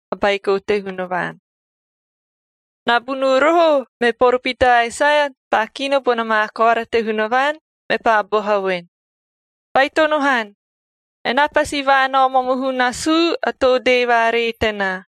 a Baiko te Hunavaan. Nabunuu roho me poropita Aesaia paa kino bona maa koara te Hunavaan, mepaa boha voen, “Baitono han! Enaa pasi vaanao momohu nasuu a too dee vaaree tenaa,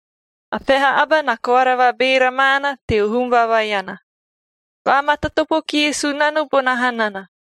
“A peha aba na koara vabeera maana teo hum vaevaeana, ‘Vaamatatopo kie Sunano bona hanana,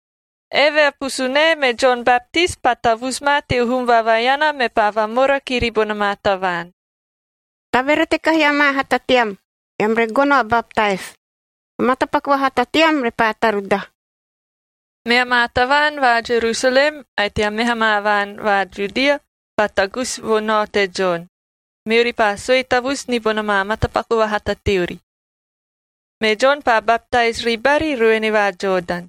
Eve a pusunae me Jon Baptis paa tavusu ma teo hum vaevaeana, mepaa vamora kiri bona maa tavaan, “Taverete kahi amaa hata team, eam re gono a baptais.d O matapaku vahata team repaa tarudaha.” Mea maa tavaan va Jerusalem ae tea meha maa vaan va Judia paa tagusi vo nao te Jon, meori paa sue tavusu ni bona maa matapaku vahata teori. Me Jon paa baptais ribari ruene va Jodan.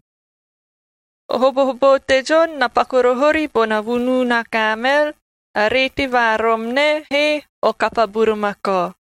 O hobohoboo te Jon na paku roho ori bona vunuu na kaamel, a reeti va rom nae he o kapa burumakao,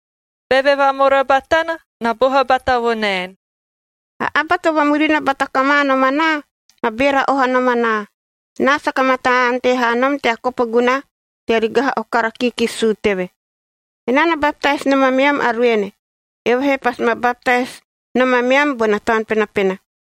Beve vamora batana, na boha bata vo naen, “A aba to vamurina bata kama nom anaa na beera oha nom anaa. Enaa saka mataa ante haa nom tea kopo gunaha tea rigaha o kara kiikisi suu teve. Enaa na baptais nom ameam a ruene, eove he pasi ma baptais nom ameam bona Taun Penapena.”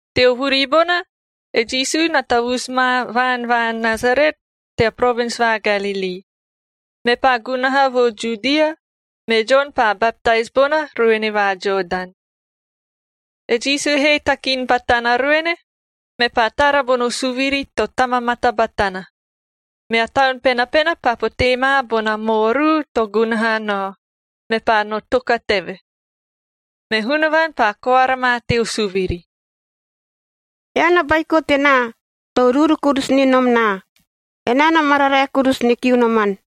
Teo vuri bona, e Jisu na tavusu ma vaan va Nasaret tea provins va Galilii, mepaa gunaha vo Judia, me Jon paa baptais bona ruene va Jodan. E Jisu he takin batana ruene, mepaa tara bono suviri to tamamata batana, mea Taun Penapena paa potee ma bona maoruu to gunaha nao, mepaa no toka teve. Me Hunavaan paa koara ma teo suviri, “Ean a Baiko tenaa, to uruuru kurusu ni nom naa. Enaa na mararae kurusu ni kiu noman.”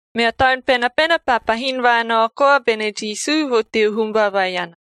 Mea Taun Penapena paa pahin vaanao koa bene Jisu vo teo hum vaevaeana.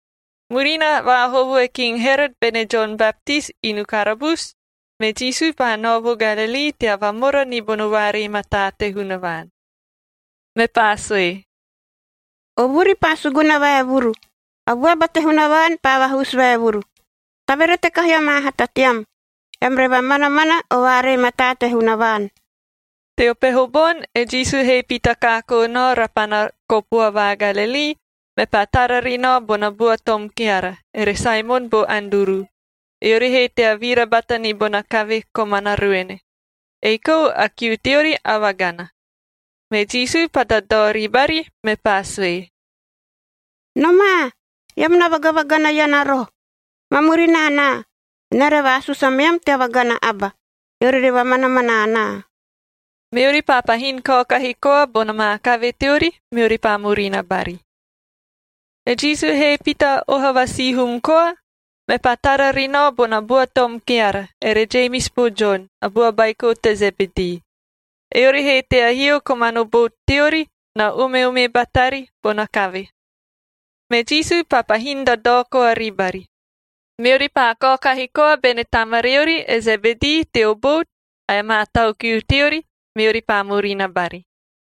Murina vaahovo e King Herot bene Jon Baptis inu karabusu, me Jisu paa nao vo Galilii tea vamora ni bono vaaree mataa te Hunavaan. Mepaa sue, “O vuri paa suguna vaevuru, a vuaba te Hunavaan paa vahusu vaevuru.h Taverete kahi amaa hata team, eam re vamanamana o vaaree mataa te Hunavaan!” Teo peho boni e Jisu he pita kaakoo nao rapana kopua va Galilii, mepaa tara ri nao bona bua tom keara, ere Saemon bo Anduru, eori he tea vira bata ni bona kave komana ruene, ei kou a kiu teori a vagana. Me Jisu paa dadao ribari, mepaa sue, “Nomaa! Eam na vagavagana iana roho. Ma murina anaa, enaa re vaasusu ameam tea vagana aba, eori re vamanamana anaa.” Meori paa pahin kaokahi koa bona maa kave teori, meori paa murina bari. E Jisu he pita oha va sihum koa, mepaa tara ri nao bona bua tom keara ere Jemis bo Jon, a bua baiko te Zebedii, eori he tea hio komano bout teori, na ume-umei batari bona kave. Me Jisu paa pahin dadao koa ribari. Meori paa kaokahi koa bene tamariori e Zebedii teo bout ae amaa tau kiu teori, meori paa murina bari.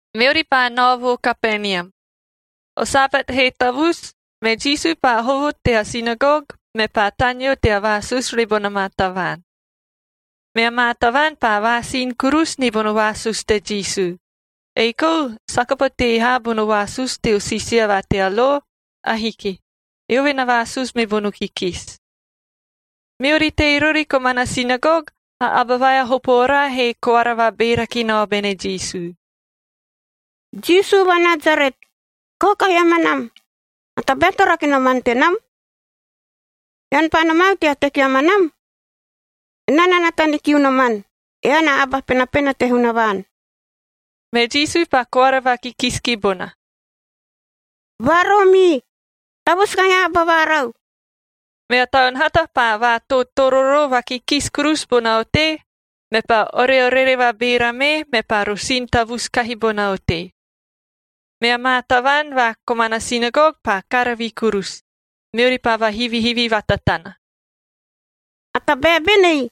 Meori paa nao vo Kapenium. O Sabat he tavusu, me Jisu paa hovo tea sinagogj mepaa taneo tea vaasusu ribona maa tavaan. Mea maa tavaan paa vaasin kurusu ni bono vaasusu te Jisu, ei kou saka potee haa bono vaasusu teo siisia va tea lo. Ahiki. Eove na vaasusu mi bono kikisi. Meori tei rori komana sinagog, a aba vai a hopo oraa he koara vabeera ki nao bene Jisu, “Jisu va Nasaret, kaokahi amanam! A tabae to rake noman tenam? Ean paa nomau tea teki amanam? Enaa na nata ni kiu noman, ean a Aba Penapena te Hunavaan!” Me Jisu paa koara vakikisi ki bona, “Vaaroomii! Tavusu kahi a aba varau!” Mea taun hata paa vaatootororoo vakikisi kurusu bona otei, mepaa oreorere vabeera mee, mepaa rosin tavusu kahi bona otei. Mea maa tavaan va komana sinagog paa karavi kurusu, meori paa vahivihivi vatatana, “A tabae benei?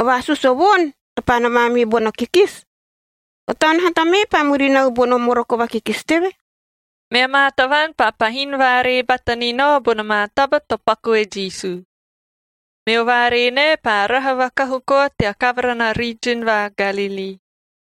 O vaasusu o voon to paa nomaa miu bono kikisi! O taun hata mee paa murinau bono moroko vakikisi teve.” Mea maa tavaan paa pahin vaaree bata ni nao bona maa taba to paku e Jisu. Meo vaaree nae paa raha vakahu koa tea kavara na riijin va Galilii.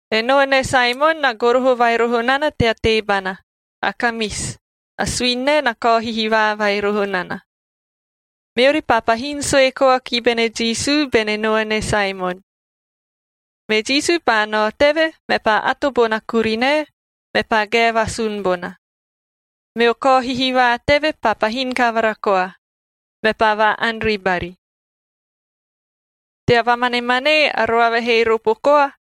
E noane Saemonk na goroho vai roho nana tea teebana, a kamisi, a suini nae na kao hihivaa vai roho nana. Meori paa pahin sue koa ki bene Jisu bene noane Saemon. Me Jisu paa nao teve, mepaa ato bona kurinae, mepaa gae vasun bona. Meo kao hihivaa teve paa pahin kavara koa, mepaa vaa-ani ribari. Tea vamanemanee, a roava he ropo koa,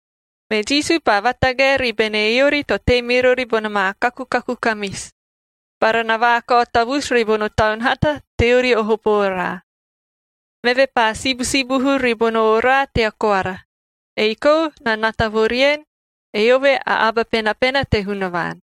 Me Jisu paa vatagae ribene eori to tei mi rori bona maa kakukaku kamisi, bara na vaakao tavusu ribono taun hata teori o hopo oraa. Meve paa sibusibuhu ribono oraa tea koara, ei kou na nata vo rien, eove a Aba Penapena te Hunavaan.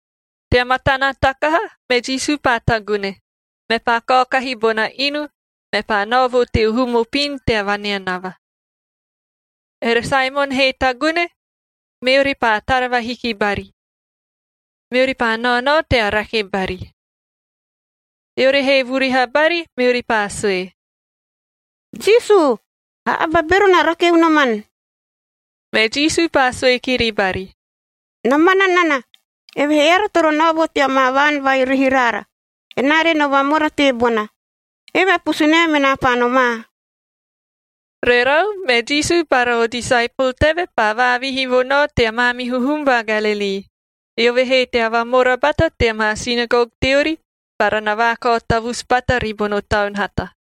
Tea matana takaha, me Jisu paa tagune, mepaa kaokahi bona inu, mepaa nao vo teo hum opin tea vaneanava. Ere Saemon he tagune, meori paa tara vahiki bari, meori paa naonao tea rake bari. Eori he vuriha bari, meori paa sue, “Jisu, a aba a bero na rake unoman!” Me Jisu paa sue kiri bari, “Na mana nana, evehee eara toro nao vo tea maa vaan vai rihi raara, enaa re no vamora teebona. Eve a pusunae menaa paa nomaa.” Rerau, me Jisu bara o disaepol teve paa vaavihi vo nao tea maamihu hum va Galilii, eove he tea vamora bata tea maa sinagog teori bara na vaakao tavusu bata ribono taun hata.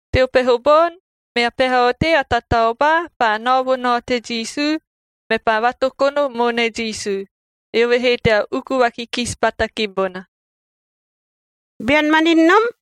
Teo peho boni mea peha otei a tataobaa paa nao vo nao te Jisu, mepaa vatokono moone Jisu, eove he tea uku vakikisi bata ki bona, “Bean manin nom,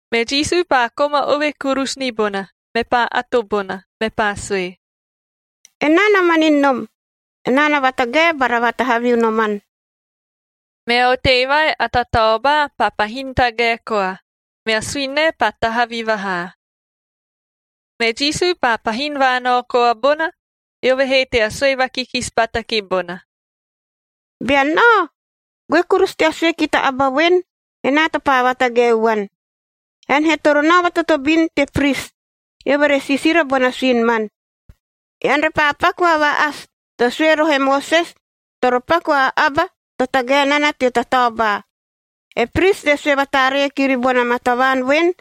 Me Jisu paa koma ove kurusu ni bona, mepaa ato bona, mepaa sue, “Enaa na manin nom. Enaa na vatagae bara vatahavi unoman.” Mea otei vai a tataobaa paa pahin tagae koa, mea suini nae paa tahavi vahaa. Me Jisu paa pahin vaanao koa bona, eove he tea sue vakikisi bata ki bona, “Bean nao, goe kurusu tea sue ki ta aba voen, enaa to paa vatagaeu vuan. Ean he toro nao vatotobin te pris,n eove re siisira bona suini man, ean repaa paku a va-asio to sue roho e Moses toro paku a aba to tagae nana teo tataobaa. E pris re sue vataaree kiri bona maa tavaan voen,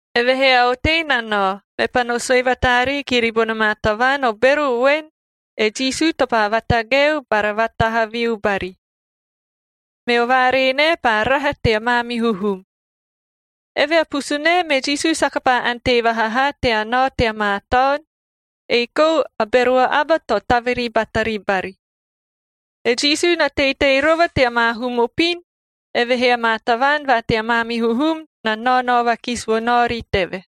Evehee a otei na nao, mepaa no sue vataaree kiri bona maa tavaan o bero voen, e Jisu to paa vatagaeu bara vaatahaviu bari. Meo vaaree nae paa raha tea maamihu hum. Eve a pusunae me Jisu saka paa ante vaha haa tea nao tea maa taon, ei kou a bero aba to taviri batari bari. E Jisu na teitei rova tea maa hum opin, evehee amaa tavaan va tea maamihu hum na naonao vakisi vo naori teve.